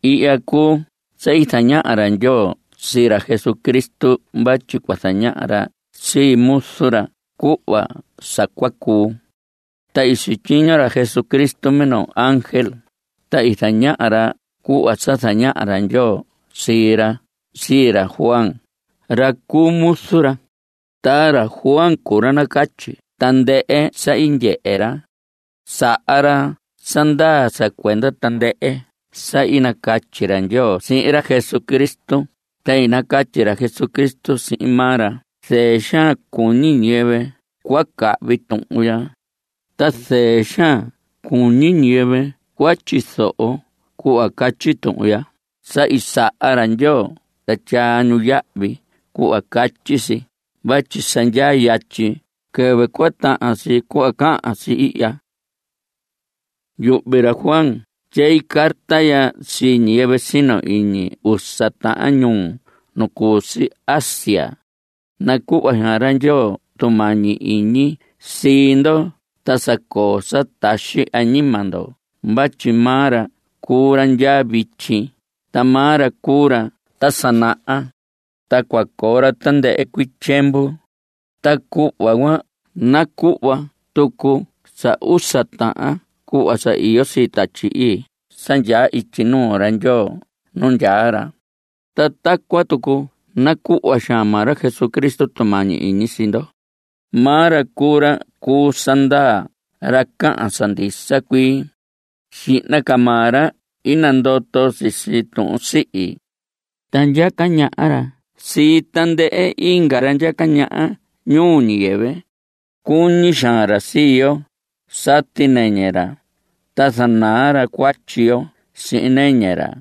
Ihya cuu sa i zañaha ra Ndyoo sii ra Jesucristo vatyi cua zañaha ra sii muzu ra cuhva sa cua cuu. Ta i sityiño ra Jesucristo minoo ángel, ta i zañaha ra cuhva sa zañaha ra Ndyoo sii ra sii ra Juan, ra cu muzu ra. Ta ra Juan cuu ra nacatyi tandɨhɨ sa i ndyehe ra. Saha ra sa ndaa sa cuenda tandɨhɨ sa i catyi ra Ndyoo sihin ra Jesucristo ta i nacatyi Jesucristo sihin maa ra. Zɨɨ xaan cuñi ñiyɨvɨ cua cahvi tuhun ya, ta zɨɨ xaan cuñi ñiyɨvɨ cua tyizoho cuhva catyi tuhun ya sa i saha ra Ndyoo ta tyaa ñu yahvi cuhva catyi si vatyi sa ndyaa yatyi quɨvɨ cua tahan si cuhva cahan si ihya. Yuhvi ra Juan tyei carta ya sii ñiyɨvɨ sino iñi usa tahan ñuu nu cu si Asia. Nacuhva xaan ra Ndyoo tumañi iñi sii ndo ta sa coo sa taxi añima ndo vatyi maa ra cuu ra ndya vityi, ta maa ra cuu ra ta sa naha, ta cua coo ra tandɨhɨ cuii tyiemvu. Ta cuhva cuan nacuhva tucu sa usa tahan cuhva sa iyo sii Tatyi Ii sa ndyaa ityi nuu ra Ndyoo nu ndyaa ra. Ta tacuan tucu nacuhva xaan maa ra Jesucristo tumañi iñi sii ndo. Maa ra cuu ra cu sa ndaa ra cahan sa ndisa cuii. Xihna ca maa ra i nandoto sisi tuhun sihi, ta ndyaca ñaha ra sii tandɨhɨ inga ra ndyaca ñaha ñuu ñiyɨvɨ. Cuñi xaan ra sii yo. Sati nɨñɨ ra, ta zanaa ra cuatyi yo sihin nɨñɨ ra.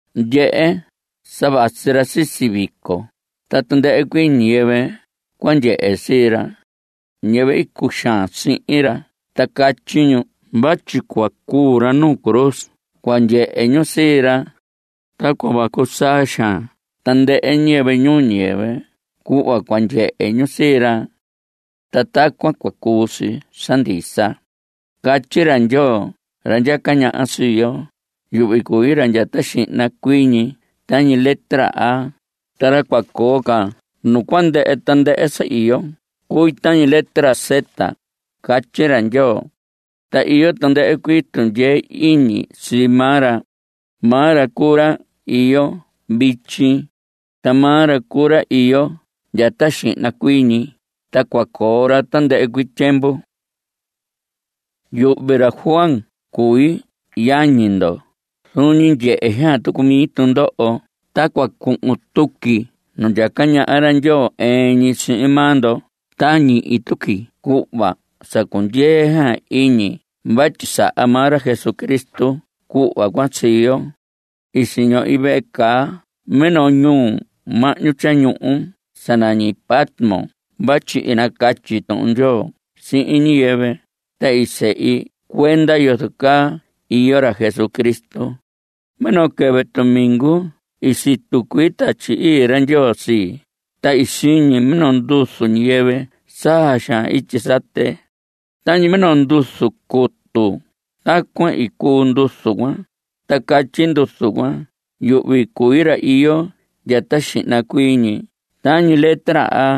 ¡Ndyehe!, sa vasi ra sisi vico, ta tandɨhɨ cuii ñiyɨvɨ cua ndyehe sii ra. Ñiyɨvɨ i cuxaan sihin ra ta catyi ñu vatyi cua cuu ra nuu cruz cua ndyehe ñu sii ra. Ta cua vacu saa xaan tandɨhɨ ñiyɨvɨ ñuu ñiyɨvɨ cuhva cua ndyehe ñu sii ra. Ta tacuan cua cuu si sa ndisa. Catyi ra Ndyoo ra ndyaca ñaha sii yo: Yuhvi cui ra ndya ta xihna cuii ñi tañi letra A, ta ra cua coo ca nu cua ndɨhɨ tandɨhɨ sa iyo cui tañi letra Z, catyi ra Ndyoo. Ta iyo tandɨhɨ cuii tundyee iñi sii maa ra. Maa ra cuu ra iyo vityi, ta maa ra cuu ra iyo ndya ta xihna cuii ñi, ta cua coo ra tandɨhɨ cuii tyiemvu. Yuhvi ra Juan cui yañi ndo. Zuun ñi ndyehe xaan tucu mi tundoho ta cua cuhun tuqui nu ndyaca ñaha ra Ndyoo ɨɨn ñi sihin maa ndo. Ta ñihi tuqui cuhva sa cundyee xaan iñi vatyi saha maa ra Jesucristo cuhva cuan sii yo. I siñohi vehe caa minoo ñuhu mahñu tyañuhu sa nañi Patmos vatyi i nacatyi Tuhun Ndyoo sihin ñiyɨvɨ, ta i sehi cuenda yozo caa iyo ra Jesucristo. Minoo quɨvɨ tumingu i situ cuii Tatyi Ii ra Ndyoo sii, ta i siñi minoo nduzu ñiyɨvɨ saa xaan ityi sate. Tañi minoo nduzu cutu, tacuan i cuu nduzu cuan. Ta catyi nduzu cuan: Yuhvi cui ra iyo ndya ta xihna cuii ñi tañi letra A,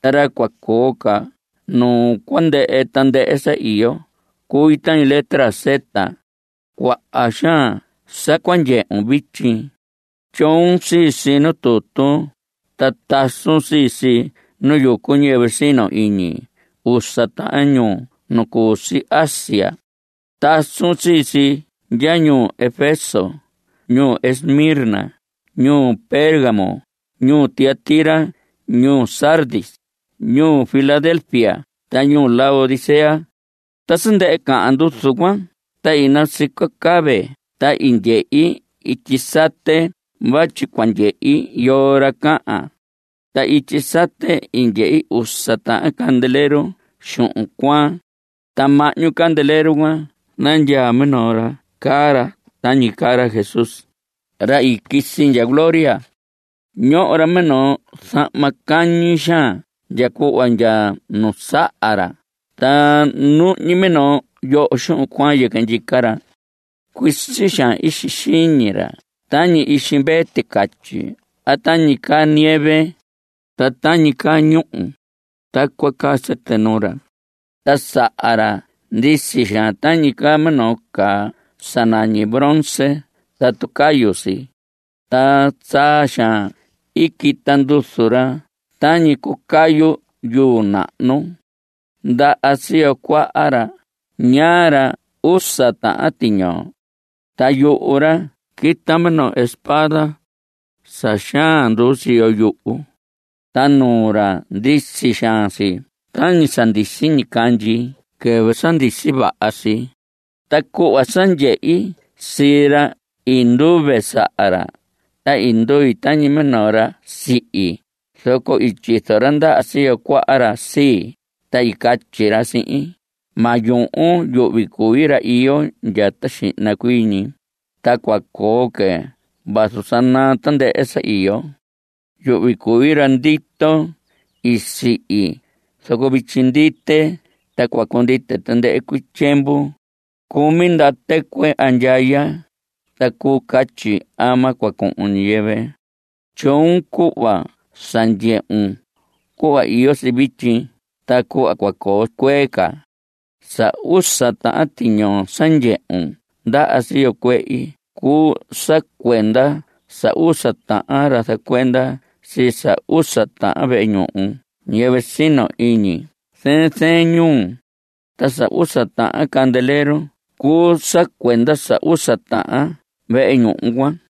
ta ra cua coo ca nu cua ndɨhɨ tandɨhɨ sa iyo cui tañi letra Z. Cuaha xaan sa cua ndyehun vityi. Tyoon sii si nu tutu, ta tasun sii si nu yucu ñiyɨvɨ sino iñi usa tahan ñuu nu cu si Asia. Tasun sii si ndya ñuu Efeso, ñuu Esmirna, ñuu Pérgamo, ñuu Tiatira, ñuu Sardis, ñuu Filadelfia ta ñuu Laodicea. Ta sa ndɨhɨ cahan nduzu cuan ta i nasico cave ta i ndyehi ityi sate vatyi cua ndyehi yoo ra cahan. Ta ityi sate i ndyehi usa tahan candelero xuhun cuaan. Ta mahñu candelero cuan nandyaa minoo ra caa ra tañi caa ra Jesús, ra i quisi ndya gloria. Ñoho ra minoo zahma cañi xaan ndya cuhva ndya nu saha ra, ta ñuhñi minoo yoho xuhun cuaan yɨquɨ ndyica ra. Cuisi xaan ixi xiñi ra tañi ixi mvee ticatyi a tañi caa ñieve. Ta tañi caa ñúhu, tacuan caa sɨtɨ nuu ra. Ta saha ra ndisi xaan tañi caa minoo caa sa nañi bronce tatu cayu si. Ta saa xaan quita nduzu ra tañi cucayu yuu nahnu. Ndaha siyo cuaha ra ñaa ra usa tahan tiñoo. Ta yuhu ra quita minoo espada sa xaan nduu siyo yuhu. Ta nuu ra ndisi xaan si tañi sa ndisi ñicandyi quɨvɨ sa ndisi vaha si. Ta cuhva sa ndyehi sii ra i nduve saha ra, ta i ndui tañi minoo ra sihi. Zoco i tyizo ra ndaha siyo cuaha ra sii, ta i catyi ra sihin: Ma yuhun. Yuhvi cui ra iyo ndya ta xihna cuii ñi, ta cua coo que vazu sa naa tandɨhɨ sa iyo. Yuhvi cui ra ndito. I sihi, zoco vityi ndite. Ta cua cundite tandɨhɨ cuii tyiemvu. Cumi ndaha tɨcuɨ andyaya. Ta cuu catyi ama cua cuu ñiyɨvɨ. Tyoon cuhva sa ndyehun, cuhva iyo si vityi ta cuhva cua coo cuee ca. Sa usa tahan tiñoo sa ndyehun ndaha siyo cuehi cuu sa cuenda sa usa tahan ra zacuenda sii sa usa tahan vehe ñuhu ñiyɨvɨ sino iñi zɨɨn zɨɨn ñuu. Ta sa usa tahan candelero cuu sa cuenda sa usa tahan vehe ñuhu cuan.